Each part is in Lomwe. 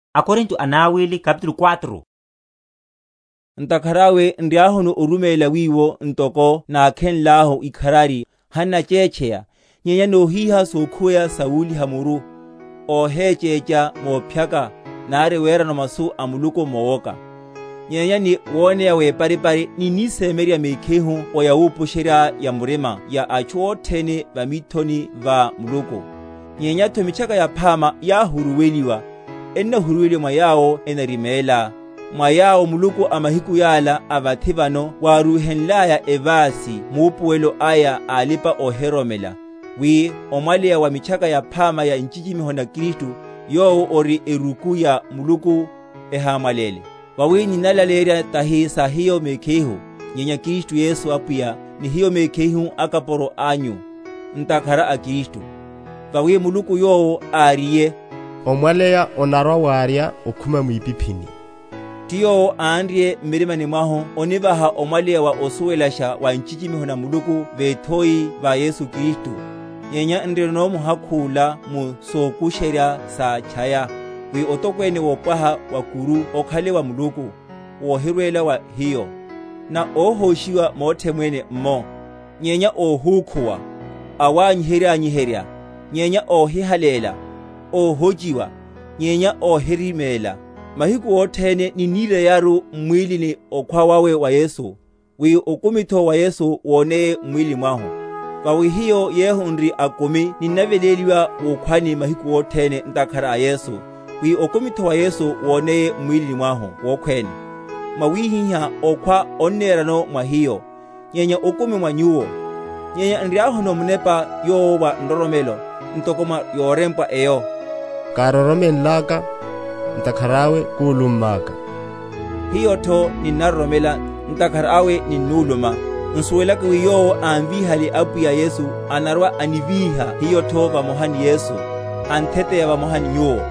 Paulo omulaleya wawe Yesuru. Ntakhara awe nriahuno oruméla wiwo, ntoko nákhenlahu ikharari, hannachétcheya; nyenya nóhíha sokhuweya sa wuliha‐muru, óhéchécha mophyaka, nari werano masu a Muluku mowoka; nyenya ni woneya weparipari ninnisemyeryerya mekhihu o yawupusherya‐ya‐murima wa atchu othene va mithoni va Muluku. Nyenyatho Mitchaka Yaphama yahuruweliwa, enahuruweliwa mwa yawo enariméla; mwa yawo muluku a mahiku yala a vathi vano wárúhenlaya evasi maupuwelo aya a alipa‐ohiroromela, wi omwaleya wa Mitchaka Yaphama ya nchichimiho na Kristu, yowo ori eruku ya Muluku, ehámwaléle. Vawi ninnalaleyerya tahi sa hiyo mekhihu, nyenya Kristu Yesu Apwiya, ni hiyo mekhihu akapuro anyu, ntakhara a Kristu. Vawi Muluku yowo áriye, Omwaleya onarwa‐warya okhuma mwipiphini, ti yowo ánrye m’mirima mwahu onivaha omwaleya wa osuwelasha wa nchichimiho na Muluku vethoini va Yesu Kristu. Nyenya nrinono muhakhu’la mu sokusherya sa’tchaya, wi otokwene wopwaha wa’kuru okhale wa Muluku, wohirwela wa hiyo; na óhóshiwa mothe mwene’mmo, nyenya óhúkhuwa; awanyiherya‐anyiherya, nyenya óhihaléla; óhochiwa, nyenya óhiriméla; mahiku othene ninnireyaru m’mwílini okhwa wawe wa Yesu, wi okumitho wa Yesu woneye m’mwílini mwahu. Vawi hiyo yehu n’ri akumi ninnaveléliwa wukhwani mahiku othene, ntakhara a Yesu, wi okumitho wa Yesu woneye m’mwílini mwahu wokhwéne. Mwawihiha okhwa onnerano mwa hiyo, nyenya okumi mwa nyuwo. Nyenya nriahuno munepa yowo wa nroromelo, ntoko mwa yorempwa eyo, károromenlaka, ntakhara awe kúlummaka; hiyotho ninnaroromela, ntakhara awe ninnuluma; nsuwelaka wi yowo ámvíhale Apwiya Yesu anarwa‐anivíha hiyotho vamoha ni Yesu, antheteya vamoha ni nyuwo.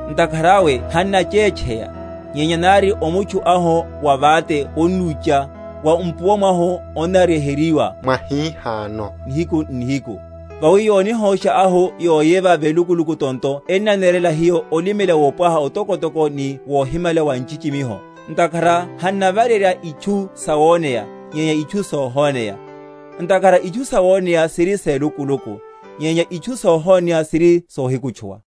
Ntakhara awe hannachétcheya; nyenya nari omutchu ahu wavate onnúcha, wa mpuwa mwahu onnaryeheryiwa mwahihano nihiku n’nihiku. Vawi yonihósha ahu yoveya velukuluku tonto ennanerela hiyo olimela wopwaha otokotoko ni wohimala wa nchichimiho; ntakhara hannavarerya itchu sawoneya, nyenya itchu sohoneya; ntakhara itchu sawoneya siri selukuluku, nyenya itchu sohoneya siri sohikutchuwa.